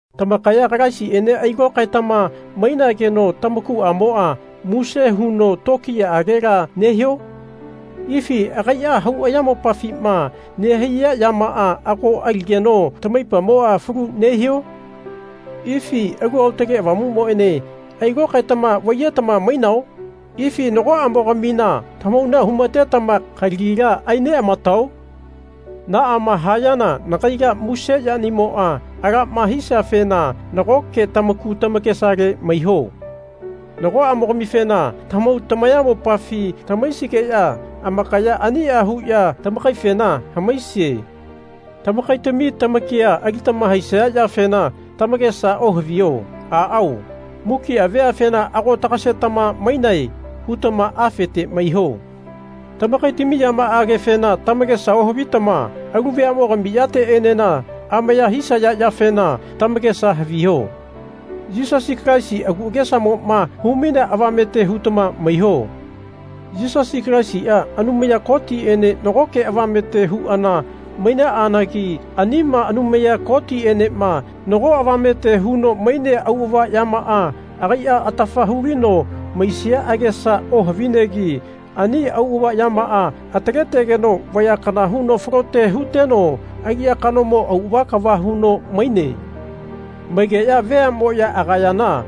Tamakaya Kalaisiene ailokaetama mainageno tamakuamoa muse huno tokiyaagela nehio? Ifi agaia hau ayamopafima nehaiya yamaa ago aligeno tamaipamoa falu nehio? Ifi Alu Aotage Avamumoene ailokaetama vaiyetama mainao? Ifi nagoamogamina tamahauna humatetama kalagila aineamatao? Naama hayana nagaila muse yanimoa alama hisiafena nagoke tamaku tamakesale maiho. Nagoamogamifena tamahau tamayamopafi tamahaisigeya amakaya ania huya tamakaifena hamaisie. Tamakaitami lamakia alitama haisaya yafena tamakesa ohaviho. Aao, mukia veafena Ago tagasetama mainae. hutama afete maiho. Tamakaitami yamaagefena tamakesa ohavitama alu veamogami yateenena amaya hisaya yafena tamakesa haviho. Yisasi Kalaisi agu agesamoma humainea avamete hutama maiho. Yisasi Kalaisia Anumaya Kotiene nagoke avamete huana mainaanagi anima Anumaya Kotienema nago avamete huno mainea auava yamaa agaia atafa hulino maisia agesa ohavinegi ani auava yamaa ataletegeno vaya kana huno falote huteno aliya kanomo auava kava huno maine. Maigeya veamoyama agayana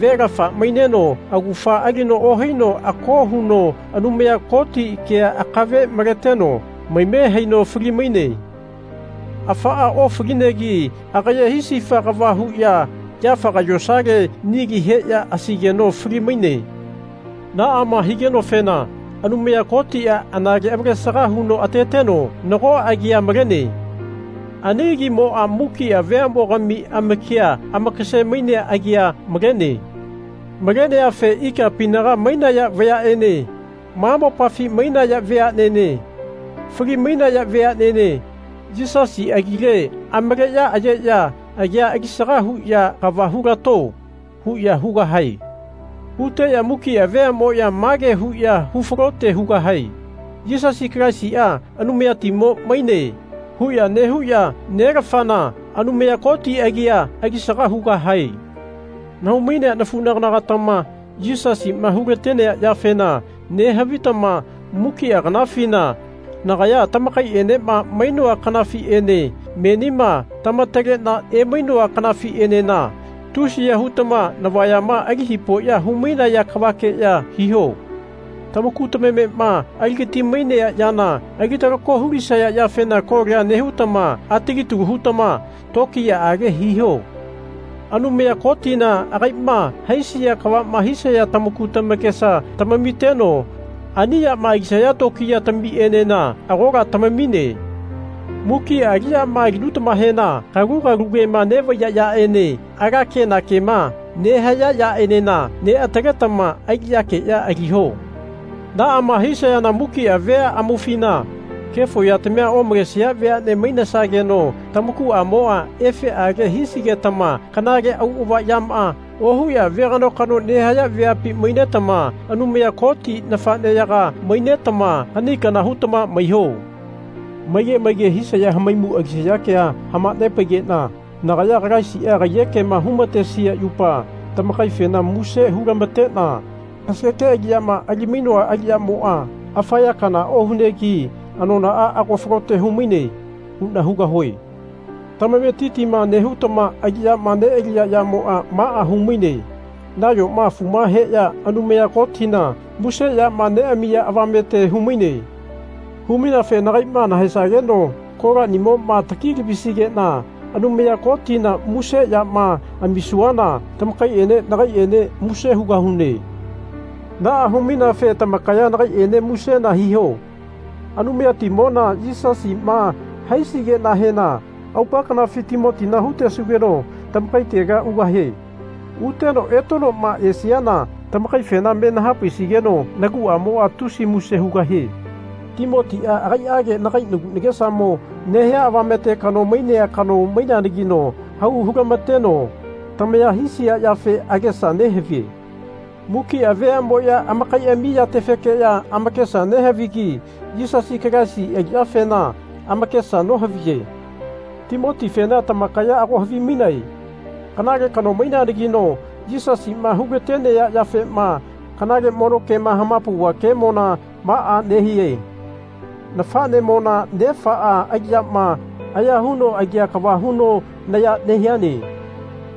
velafa maineno augafa alino ohaino ako huno Anumaya Koti kea akave maleteno maime haino fali-maine. Afaa ofalinegi agaye hisifa kava huya yafaga yosale nili heya asaigeno fali-maine. Naama higenofena Anumaya Kotia anale avalesaga huno ateteno nago agia malene. Ani agimoa mukia veamogami amakia amakase-mainea agia malene. Maleneafe ikapinaga mainaya vayaene ma mopafi mainaya veanene fali-mainaya veanene Yisasi agile amaleya ayeya agia alisaga huya Kava hulato. huya hugahae. Huteya mukia veamoya mage huya hufalote hugahae Yisasi Kalaisia Anumayatimo maine. huya nehuya Nelafana, Anumaya Koti agia alisaga hugahae. Nahau-mainea nenafugatama Yisasima hulatenea yafena nehavitama mukia kanafina, nagaya tamakaienema mainoa kanafiene, menima tamatalena emainoa kanafienena tusiya hutama navayama ali hipoya humainaya kavakeya hiho. Tamaku tamamema aligati-mainea yana ali-talako hulisaya yafena kolia nehutama atali talu hutama tokiyaage hiho. Anumaya Kotina agaima haisia kavama hisaya tamaku tamakesa tamamiteno ani yama alisaya tokiyatamienena agola tamamine. Mukia aliyama alinutamahena kalugalu kema vaiya yaene ala kenakema nehaya yaenena neataletama aliyakeya aliho. Naama hisayana mukia vea amaufina kefo yatamia omalesia veane mainesageno tamakuamoa efeage hisigetama kanale auava yama ohuya vegano-kano nehaya veapi mainetama Anumaya Koti nafaneyaga mainetama kani kana hutama maiho. Maige maige hisaya hamaimu alisaya kea hamanepaigena nagaya Kalaisia kaiyekema humatesia yupa tamakaifena muse hulamatena Kasageke aliyama ali-mainoa aliyamoa afa ya kanala ohunegi anonaa ago falote humaine. huna hugahue. Tamametitima nehutama aliyama nealiya yamoa maa humaine nayoma afu heya Anumaya Kotina muse yama neamiya avamete humaine. Humaineafe nagaima nahaesageno kolaniamoma taki-lavisigena Anumaya Kotina muse yama amisuana tamakaiene nagaiene muse hugahune. Naa humaineafe tamakaya nagaiene musena hiho. Anumayatimona Yisasima haisigenahena aupa kanafi Timotina hutesugeno tamakaitega ugahie. Uteno etenoma esiana tamakaifena me nahapaisigeno naguamoa tusi muse hugahie. Timotia agaiage nagai nagu nagesamo nehia avamete kano mainea kano maineanagino hau hulamateno tamaya hisia yafe agesa nehavie. Mukia veamoya amakaiami yatefekeya amakesa nehavigi Yisasi Kalaisi aliyatefena amakesa nohaviye. Timotifena tamakaya ago havimainae. Kanale kano maineanagino Yisasima hulatenea yafema kanale mono kema hamapauva kemona maa nehie nafanemona nefaa aliyama aya huno alia kava huno naya nehiane.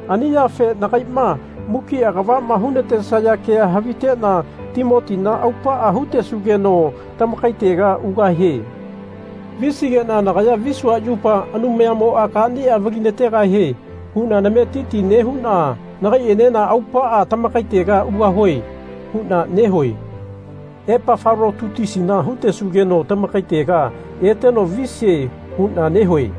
Ani yafe nagaima mukia kavama hunatesaya kea havitena Timotina aupaa hutesugeno tamakaitega ugahie. Visigena nagaya visua yupa Anumayamoa kania vali-nategahie huna nametitia nehuna nagaienena aupaa tamakaitega ugahue huna nehue. Epafalotitusina hutesugeno tamakaitega eteno visie huna nehue.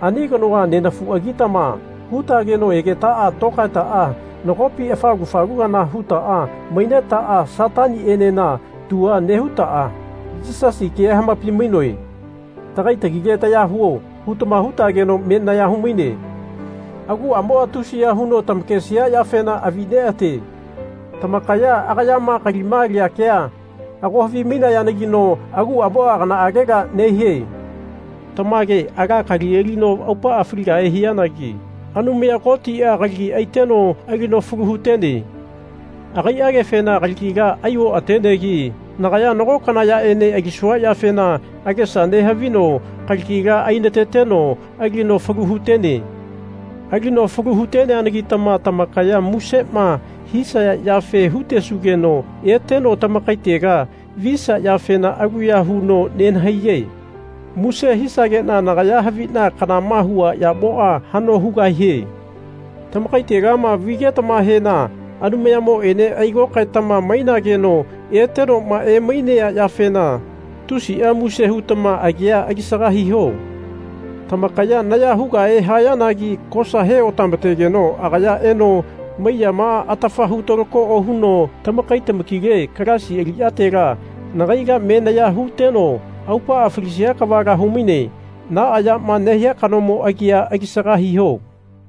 Ani kanoa nenafuagitama hutageno egetaa lokaetaa nagopi afalu-falu kana hutaa mainetaa Satanienena tua nehutaa Yisasi kea hamapai-mainoe. Tagai tagile taya huo. hutama hutageno me naya humaine. Aguamoa tusiya huno tamakesia yafena avianeate. Tamakaya agayama kalima alia kea ago havimainayanagino aguamoa kanaagela nehie. Tamage ala kali alino aupaa faligahe hianagi Anumaya Kotia kalagi aiteno alino falu hutene. Agaiagefena kalagila ai oatenegi nagaya nago kana yaene alisua yafena agesa nehavino kalagila ainateteno alino falu hutene. Alino falu hu-teneanagitama tamakaya musema hisaya yafe hutesugeno eteno tamakaitega visia yafena aluya huno nenahaiye. Muse hisagena nagaya havina kanama hua yamoa hano hugahie. Tamakaitegama vigetamahena Anumayamoene ailokaetama mainageno etenoma emainea yafena tusia muse hutama agia alisaga hiho. Tamakaya naya hugahe hayanagi kosa he-otamategeno agaya eno maiyamaa atafa hu-talako ohuno tamakai tamakile Kalaisi aliyatela nagaila me naya huteno aupaa falisia kavala humaine. Naa yama nehia kanomo agia alisaga hiho.